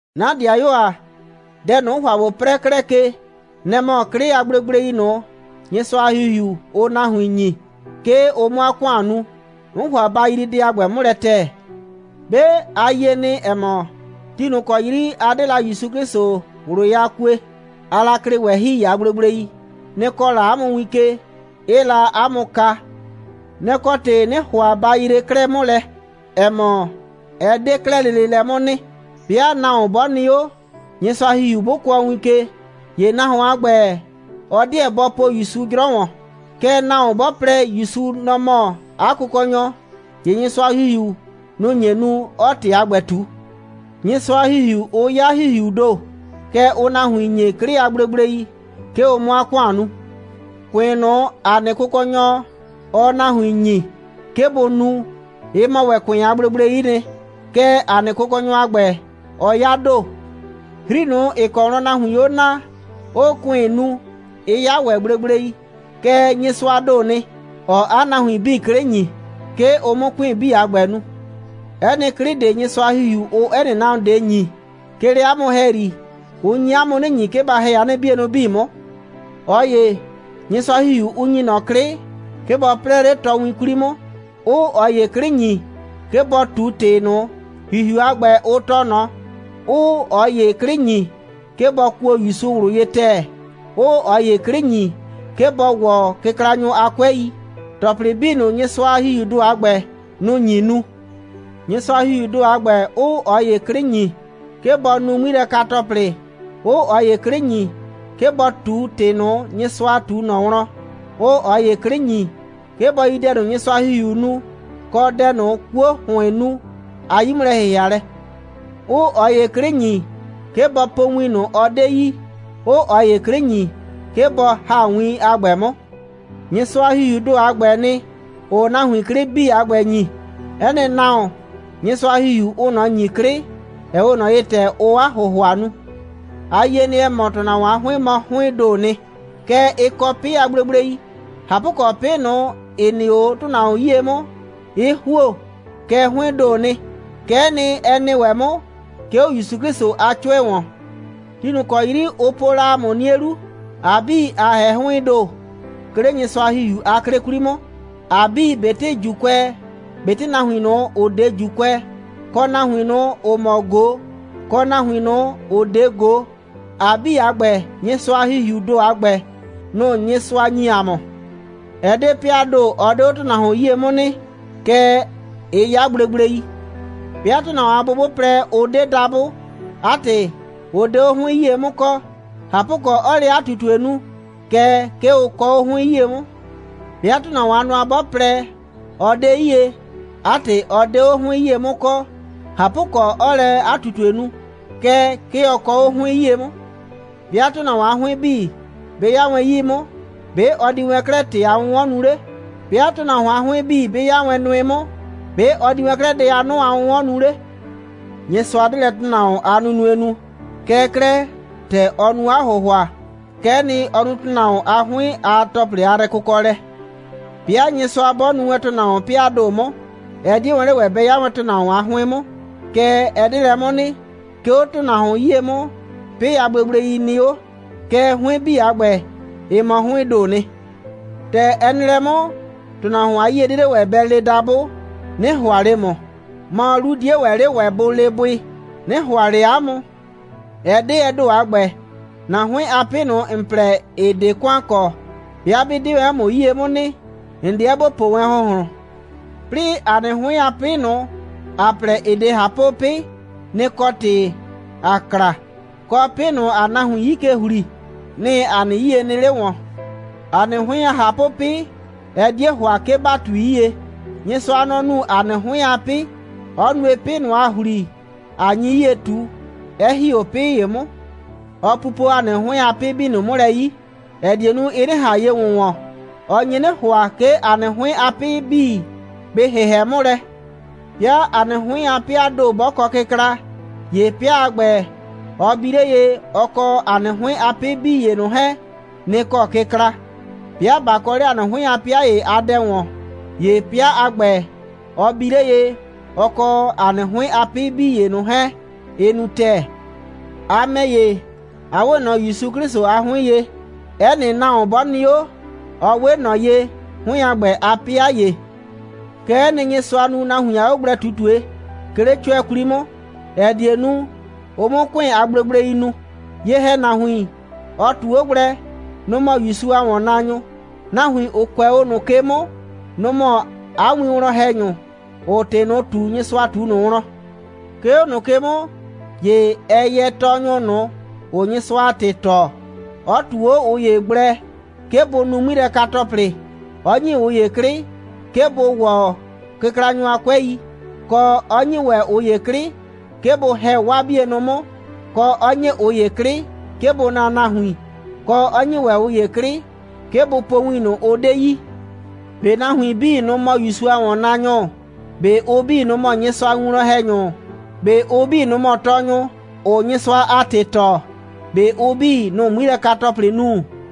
'Na ‑dɩayuo ‑a, dɛ ꞊nʋ, 'n ‑hʋa ꞊bo 'prɛɛ 'klɛɛ ke, nɛ‑ mɔ 'klɩ a gblegblei ꞊nʋ, Nyɩsʋa a ‑Hihiu, ʋʋ nahuin ‑nyi, 'ke ʋ 'mʋ 'a ‑kʋan nu. 'N ‑hʋa ba yrii dɛ a ‑gbɛ 'mʋ lɛ ‑tɛɛ. 'Be, a yie nɩ, ‑ɛ mɔ, ti ꞊nʋ ‑kɔ 'yri a 'de la ‑Yusu 'Klɩsʋ ꞊wlʋ ye a kue, aa la klɩ ꞊wɛhɩi a gblegblei. Nɩ‑ kɔɔ la 'a mʋ win ke, 'ɩɩ la 'a mʋ kaa. Nɛ‑ kɔ ‑tɩ 'nɩɩ ‑hʋa ba yree 'klɛɛ 'mʋ lɛ, ‑ɛ mɔ, ɛ 'de 'klɛɛ lele lɛ 'mʋ nɩ. 'Bɩa nahuon 'bɔ nɩ 'o, Nyɩsʋa a ‑Hihiu 'bʋ kʋɔ win ke, ‑ye nahuon a ‑gbɛ, ɔ 'deɛ bɔ po ‑Yusu 'jrɔ ‑wɔn. Kɛɛ, nahuon 'bɔ plɛ, ‑Yusu, nɔ‑ mɔ 'a Kʋkɔnyɔ, ‑ye Nyɩsʋa a ‑Hihiu, nʋ‑ nye nu, 'ɔɔ ‑tɩ a ‑gbɛ ꞊tu. Nyɩsʋa a ‑Hihiu, ʋ 'ya ‑Hihiuu ‑do, kɛɛ, ʋʋ nahuin ‑nyi 'klɩ a gblegblei, 'ke ʋ 'mʋ 'a ‑kʋan nu. ‑Kʋɩn ꞊nʋ, ‑a nɩ Kʋkɔnyɔ, ɔɔ nahuin ‑nyi, 'ke bʋ nu, ɩ mɔ ‑wɛ ‑kʋɩn a gblegblei'i nɩ. Kɛɛ, ‑a nɩ Kʋkɔnyɔ a ‑gbɛ, ɔ 'ya ‑do. 'Hri ꞊nʋ, ‑ɩ kɔ wlɔn nahuiin 'o naa, 'ʋʋ ‑kʋɩn nu, ɩ 'ya ‑wɛ gblegblei. Kɛɛ, Nyɩsʋaa ‑do nɩ, ‑ɔɔ 'a nahuin 'bii 'klɩ ‑nyi, 'ke ʋ 'mʋ ‑kʋɩn 'bii a ‑gbɛ nu. 'Ɛ nɩ 'klɩ ꞊de, Nyɩsʋa a ‑Hihiu, ʋʋ 'ɛ nɩ nahuon ꞊de ‑nyi, 'ke 'le 'a mʋ ‑hɛyri, ʋ nyi 'a mʋ 'nɩ ‑nyi, 'ke ba ‑hɛ 'a nɩ 'bienʋ 'bii 'mʋ. ꞊Ɔ ‑ye, Nyɩsʋa a ‑Hihiu, ʋʋ ‑nyi ꞊nɔ 'klɩ, 'ke bɔ 'prɛɛ 'le ꞊tɔwin 'kwli 'mʋ, 'ʋʋ ꞊ɔ ‑ye 'klɩ ‑nyi, 'ke bɔ ꞊tu ‑tɩ ꞊nʋ, ‑Hihiu a ‑gbɛ, ʋ tɔɔ ꞊nɔ, 'ʋʋ ꞊ɔ ‑ye 'klɩ ‑nyi, 'ke bɔ kuo ‑Yusu ꞊wlʋ ye ‑tɛɛ, 'ʋʋ ꞊ɔ ‑ye 'klɩ ‑nyi, 'ke bɔ ‑wɔ kɩklanyʋ a 'kʋɛi. ‑Tɔplɩ 'bii ꞊nʋ, Nyɩsʋa a ‑Hihiuu ‑do a ‑gbɛ, nʋ‑ nyi nu; Nyɩsʋa a ‑Hihiuu ‑do a ‑gbɛ 'ʋʋ ꞊ɔ ‑ye 'klɩ ‑nyi, 'ke bɔ nu 'ŋmilɛka‑tɔplɩ, 'ʋʋ ꞊ɔ ‑ye 'klɩ ‑nyi, 'ke bɔ ꞊tu ‑tɩ ꞊nʋ, Nyɩsʋa ꞊tu ꞊nɔ wlɔn, 'ʋʋ ꞊ɔ ‑ye 'klɩ ‑nyi, 'ke bɔ yi dɛ ꞊nʋ, Nyɩsʋa a ‑Hihiuu nu, kɔ dɛ ꞊nʋ, 'kuo ‑hʋɩɩn nu a 'yi'mʋlɛ‑hɩhɩalɛ; 'ʋʋ ꞊ɔ ‑ye 'klɩ ‑nyi, 'ke bɔ po win ꞊nʋ, ɔ 'de yi, 'ʋʋ ꞊ɔ ‑ye 'klɩ ‑nyi, 'ke bɔ ‑ha win a ‑gbɛ 'mʋ. Nyɩsʋa a ‑Hihiuu ‑do a ‑gbɛɛ nɩ, ‑ʋʋ nahuin 'klɩ 'bii a ‑gbɛ ‑nyi. 'Ɛ nɩ nahuon, Nyɩsʋa a ‑Hihiu, ʋʋ ꞊nɔ ‑nyi 'klɩ, ‑ɛ 'we ꞊nɔ ye, ‑tɛ ʋʋ 'a ‑hʋhʋa nu. ‑A yie nɩ, ‑ɛ mɔ, ‑tʋnahuon a 'hʋɩn mɔ 'hʋɩɩn ‑doo nɩ. Kɛɛ, ɩ kɔ 'pɩ a gblegblei. ꞊Hapʋkɔ, 'pɩ ꞊nʋ, ‑ɩ nɩ 'o ‑tʋnahuon 'yie 'mʋ, 'ɩ ‑huo, kɛɛ 'hʋɩɩn ‑doo nɩ. Kɛ'ɛ nɩ, ɛ nɩ ‑wɛ 'mʋ, 'ke 'o ‑Yusu 'Klɩsʋ a 'cʋɛ ‑wɔn. Ti ꞊nʋ ‑kɔ 'yri, ʋ po la ‑a mʋ 'nie 'lu, ‑a 'bii, ‑a ‑hɛ 'hʋɩɩn ‑do, 'ke 'le Nyɩsʋa a ‑Hihiu a 'klɩ 'kwli 'mʋ. ‑A 'bii, ꞊betɩ ‑Juukʋɛ, ꞊betɩ nahuin ꞊nʋ, ‑ʋ 'de ‑Juukʋɛ, kɔ nahuin ꞊nʋ, ‑ʋ mɔ ꞊go, kɔ nahuin ꞊nʋ, ‑ʋ 'de ꞊go, ‑a 'bii a ‑gbɛ, Nyɩsʋa a ‑Hihiuu ‑do a ‑gbɛ, nʋ‑ Nyɩsʋa ‑nyi ‑a mʋ. Ɛ 'de 'pɩaa ‑do, ɔ 'de 'o ‑tʋnahuon 'yie 'mʋ nɩ, kɛɛ, ɩ 'ya gblegblei. 'Bɩa ‑tʋnahuon a bʋ 'bʋ plɛ, ʋ 'de dabʋ, 'a ‑tɩ, ʋ 'de 'o 'hʋɩn 'yie 'mʋ kɔ, ꞊hapʋkɔ, 'ɔɔ lɛ 'a ꞊tutue nu, kɛɛ, 'ke ʋ kɔ 'o 'hʋɩn 'yie 'mʋ. 'Bɩa ‑tʋnahuon a nʋa 'bɔ plɛ, ɔ 'de 'yie, 'a ‑tɩ, ɔ 'de 'o 'hʋɩn 'yie 'mʋ kɔ, ꞊hapʋkɔ, 'ɔɔ lɛ 'a ꞊tutue nu, kɛɛ, 'ke ɔ kɔ 'o 'hʋɩn 'yie 'mʋ. 'Bɩa ‑tʋnahuon a 'hʋɩn 'bii 'bɩ 'ya wɛn 'yii 'mʋ, ‑be' ɔ di wɛn 'klɛɛ ‑tɩ a 'wʋnwɔn nu 'le? 'Bɩa ‑tʋnahuon a 'hʋɩn 'bii 'bɩ 'ya wɛn nʋɩ 'mʋ, ‑be' ɔ di wɛn 'klɛɛ dɛ a 'nʋ a 'wʋnwɔn nu 'le? Nyɩsʋa 'de lɛ ‑tʋnahuon a 'hʋɩn a nunue nu. Kɛɛ 'klɛɛ, ‑tɛ ɔ nu 'a ‑hʋhʋa, kɛ'ɛ nɩ, ɔ nu ‑tʋnahuon a 'hʋɩn a ‑tɔplɩ a yrɛkʋkɔlɛ. 'Bɩa Nyɩsʋa 'bɔ nuu wɛn ‑tʋnahuon 'pɩaa ‑do 'mʋ, ɛ 'die wɛn 'le ‑wɛ bɛ 'ya wɛn ‑tʋnahuon a 'hʋɩn 'mʋ. Kɛɛ, ɛ 'de lɛ 'mʋ nɩ. 'Ke 'o ‑tʋnahuon 'yie 'mʋ, 'pɩ a gblegblei nɩ 'o. Kɛɛ, 'hʋɩn 'bii a ‑gbɛ, ɩ mɔ 'hʋɩɩn ‑do nɩ. ‑Tɛ ɛ nɩ lɛ 'mʋ, ‑tʋnahuon a 'yie 'die 'le ‑wɛ bɛ le dabʋ: «'Nɩ ‑hʋa ꞊le ‑mʋ.» Mɔ, 'lu 'die ‑wɛ 'le ‑wɛ bʋ le bʋɩ: «'Nɩ ‑hʋa ꞊le 'a mʋ.» Ɛ 'de ɛ ‑do a ‑gbɛ. ‑Na 'hʋɩn a 'pɩ ꞊nʋ, ‑n plɛ, ‑ɩ 'de ‑kʋan kɔ, 'bɩa 'bɩ 'de wɛn 'o ‑mʋ 'yie 'mʋ nɩ, ‑n 'deɛ ‑bo po wɛn ‑hʋnhlʋn. 'Plɩɩ ‑a nɩ 'hʋɩn a 'pɩ ꞊nʋ, ‑a plɛ, ‑ɩ 'de ꞊hapʋ'pɩ, nɩ‑ kɔ ‑tɩ ‑a kla, kɔ, 'pɩ ꞊nʋ, ‑aa nahuin 'yi ke ‑hli, nɩ‑ ‑a nɩ 'yie nɩ 'le ‑wɔn. ‑A nɩ 'hʋɩn a ꞊hapʋ'pɩ, ɛ 'die ‑hʋa, 'ke ‑ba ꞊tui 'yie. Nyɩsʋa, nɔ‑ nu ‑a nɩ 'hʋɩn a 'pɩ, 'ɔ nue, 'pɩ ꞊nʋ, ‑aa ‑hli, ꞊a nyi 'yie ꞊tu, 'ɛ ‑hi 'o 'pɩ ‑ye 'mʋ. Ɔ pupo ‑a nɩ 'hʋɩn a 'pɩ 'bii ꞊nʋ 'mʋ lɛ 'yi, ‑ɛ die nu, ɩ 'nɩ ꞊han ye ‑wʋnwɔn. Ɔ nye 'nɩ ‑hʋa, 'ke ‑a nɩ 'hʋɩn a 'pɩ 'bii, bɩ ‑hɩhɛ 'mʋ lɛ. 'Bɩa ‑a nɩ 'hʋɩn a 'pɩaa ‑do 'bɔ kɔ kɩkla, ‑ye 'pɩa a ‑gbɛ, ɔ bi 'le ye, ɔ kɔ ‑a nɩ 'hʋɩn a 'pɩ 'bii ‑ye ꞊nʋ 'hɛɛn, nɩ‑ kɔ kɩkla. 'Bɩa ꞊ba kɔ 'le ‑a nɩ 'hʋɩn a 'pɩa ‑ye a dɛ ‑wɔn, ‑ye 'pɩa a ‑gbɛ, ɔ bi 'le ye, ɔ kɔ ‑a nɩ 'hʋɩn a 'pɩ 'bii ‑ye ꞊nʋ 'hɛɛn, ɩ nu ‑tɛɛ. A ‑mɛ ‑ye, a 'we ꞊nɔ ‑Yusu 'Klɩsʋ a 'hʋɩn ye. 'Ɛ nɩ nahuon 'bɔ nɩ 'o, ɔ 'we ꞊nɔ ye 'hʋɩn a ‑gbɛ a 'pɩa ‑ye. Kɛ'ɛ nɩ, Nyɩsʋa nu nahuin a 'ogblɛ꞊tutue, 'ke 'le 'cʋɛ 'kwli 'mʋ, ‑ɛ die nu, ʋ 'mʋ ‑kʋɩn a gblegblei nu. Ye‑hɛnahuin, ɔ ꞊tu 'o gblɛ, nʋ‑ mɔ ‑Yusu a ‑wɔnnaanyʋ. Nahuin, ‑ʋ kʋɛ 'o ꞊nʋ ke 'mʋ, nʋ‑ mɔ 'a winwlɔn‑hɛnyʋ, ‑ʋʋ ‑tɩ ꞊nʋ ꞊tu, Nyɩsʋa ꞊tu ꞊nʋ wlɔn. 'Ke 'o ꞊nʋ ke 'mʋ, ‑ye ɛ yɛ tɔɔnyʋ ꞊nʋ, ‑ʋʋ Nyɩsʋa a ‑tɩ tɔɔ, 'ɔ ꞊tu 'o ꞊ʋ ‑ye gblɛ, 'ke bʋ nu 'ŋmilɛka‑tɔplɩ, 'ɔ ‑nyi ꞊ʋ ‑ye 'klɩ, 'ke bʋ ‑wɔ kɩklanyʋ a 'kʋɛi, kɔ, 'ɔ ‑nyi ‑wɛ ꞊ʋ ‑ye 'klɩ, 'ke bʋ ‑hɛ 'waa 'bienʋ 'mʋ, kɔ, 'ɔ ‑nyi ꞊ʋ ‑ye 'klɩ, 'ke bʋ naa nahuin, kɔ, 'ɔ ‑nyi ‑wɛ ꞊ʋ ‑ye 'klɩ, 'ke bʋ po win ꞊nʋ, ʋ 'de yi. ꞊Be nahuin 'bii, nʋ‑ mɔ ‑Yusu a ‑wɔnnaanyʋ? ꞊Be ʋ 'bii, nʋ‑ mɔ Nyɩsʋa a winwlɔn‑hɛnyʋ? ꞊Be ʋ 'bii, nʋ‑ mɔ tɔɔnyʋ, ‑ʋʋ Nyɩsʋa a ‑tɩ tɔɔ? ꞊Be ʋ 'bii, nʋ‑ʋ 'ŋmilɛka‑tɔplɩ nu?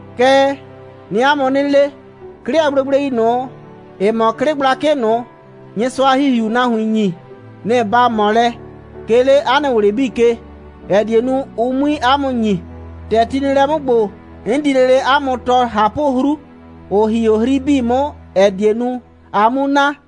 Kɛɛ, 'nɩɩ 'a mʋ 'nɩ le, 'klɩ a gblegblei ꞊nʋ, ‑ɩ mɔ 'klɩ gblakɩ ꞊nʋ, Nyɩsʋa a ‑Hihiuu nahuin ‑nyi, nɩ‑ ba ꞊mɔ lɛ, 'ke 'le 'a nɩ ꞊wlɩ 'bii ke, ‑ɛ die nu, ʋ 'mui 'a mʋ ‑nyi. ‑Tɛ ti nɩ lɛ 'mʋ ‑gbo, 'n di lele 'a mʋ tɔɔ ꞊hapʋ'hru, ‑ʋ ‑hi 'o 'hri 'bii 'mʋ, ‑ɛ die nu, a 'mu na.